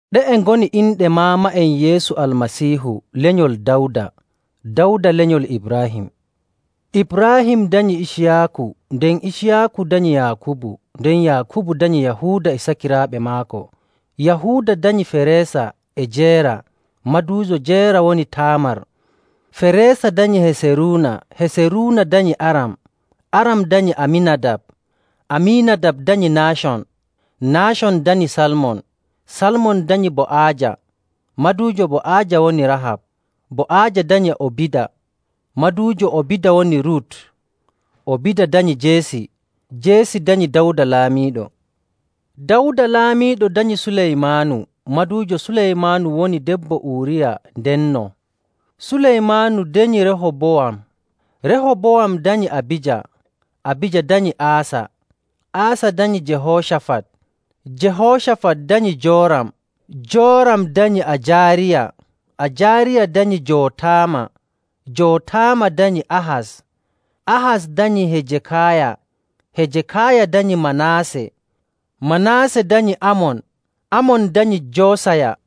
Ɗe'e ngoni inɗe maama'en Yeesu Almasiihu lenyol Dawda, Dawda lenyol Ibraahim. Ibraahim danyi Iciyaaku, nden Iciyaaku danyi Yaakubu, nden Yaakubu danyi Yahuuda e sakiraaɓe maako, Yahuuda danyi Feresa e Jeera, maduujo Jeera woni Taamar, Feresa danyi Heseruuna, Heseruuna danyi Aram, Aram danyi Amiinadab, Amiinadab danyi Naacon, Naacon danyi Salmon, Salmon danyi Bo'aaja, maduujo Bo'aaja woni Rahab, Bo'aaja danyi Obida, maduujo Obida woni Rut, Obida danyi Jeesi, Jeesi danyi Dawda Laamiiɗo, Dawda Laamiiɗo danyi Suleymaanu, maduujo Suleymaanu woni debbo Uriya ndenno, Suleymaanu danyi Rehobowam, Rehobowam danyi Abija, Abija danyi Aasa, Aasa danyi Jehoocafat, Jehoocafat danyi Jooram, Jooram danyi Ajaariya, Ajaariya danyi Jootama, Jootama danyi Ahas, Ahas danyi Hejekaaya, Hejekaaya danyi Manaase, Manaase danyi Amon, Amon danyi Joosaya,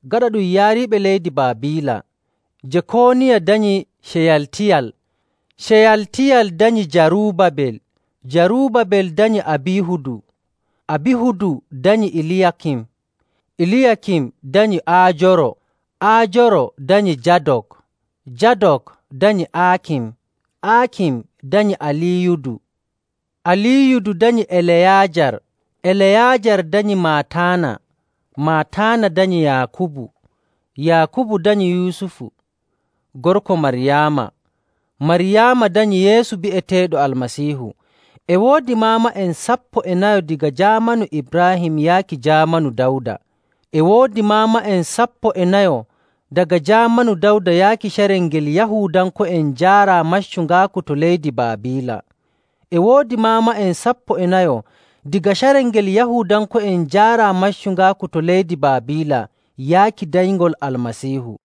Gaɗa ɗum yaariiɓe leydi Baabiila, Jekooniya danyi Ceyaltiyal, Ceyaltiyal danyi Jaruubabel, Jaruubabel danyi Abiihudu, Abiihudu danyi Eliyaakim, Eliyaakim danyi Aajoro, Aajoro danyi Jaadok, Jaadok danyi Aakim, Aakim danyi Aliiyudu, Aliiyudu danyi Eleyaajar, Eleyaajar danyi Mataana, Mataana danyi Yaakubu, Yaakubu danyi Yusufu gorko Maryaama, Maryaama danyi Yeesu bi'eteeɗo Almasiihu. E woodi maama'en sappo e nayo daga jaamanu Ibraahim yaaki jaamanu Dawda. E woodi maama'en sappo e nayo daga jaamanu Dawda yaaki carel ngel Yahuudanko'en njaaraa maccungaaku to leydi Baabiila. E woodi maama'en sappo e nayo daga carel ngel Yahuudanko'en njaaraa maccungaaku to leydi Baabiila yaaki danyngol Almasiihu.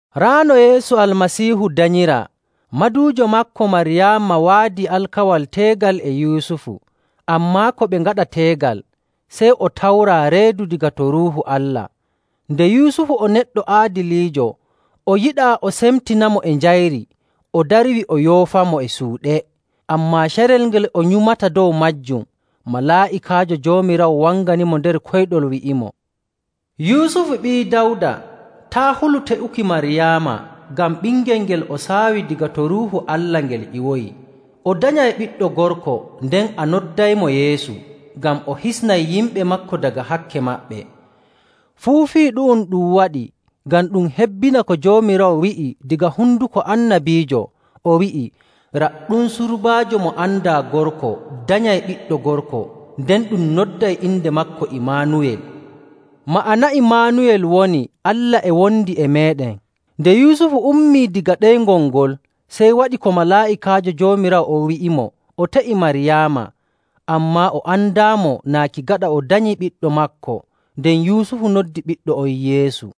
Raa no Yeesu Almasiihu danyiraa. Maduujo maako Maryaama waadi alkawal teegal e Yusufu. Ammaa ko ɓe ngaɗa teegal, sey o tawraa reedu daga to Ruuhu Allah.. Nde Yusufu o neɗɗo aadiliijo, o yiɗaa o semtinamo e njayri. O darwi o yoofamo e suuɗe. Ammaa carel ngel o nyumata dow maajum, malaa'ikaajo Joomiraawo wanganimo nder koyɗol, wi'imo, “Yusufu ɓii Dawda, taa' hulu te'uki Maryaama, ngam ɓingel ngel o saawi daga to Ruuhu Allah ngel ƴiwoyi. O danyay ɓiɗɗo gorko nden a noddaymo Yeesu, ngam o hisnay yimɓe maako daga hakke maɓɓe.” Fuu fii ɗu'um ɗum waɗi ngam ɗum hebbina ko Joomiraawo wi'i daga honduko annabiijo, o wi'i, “Raɗɗum, surbaajo mo andaa gorko danyay ɓiɗɗo gorko, nden ɗum nodday inde maako Imaanuwel.” Ma'ana Imaanuwel woni, “Allah e wondi e meeɗen.”. Nde Yusufu ummii daga ɗeyngol ngol, sey waɗi ko malaa'ikaajo Joomiraawo on wi'imo, o te'i Maryaama. Ammaa o andaamo naaki gaɗa o danyi ɓiɗɗo maako. Nden Yusufu noddi ɓiɗɗo on Yeesu..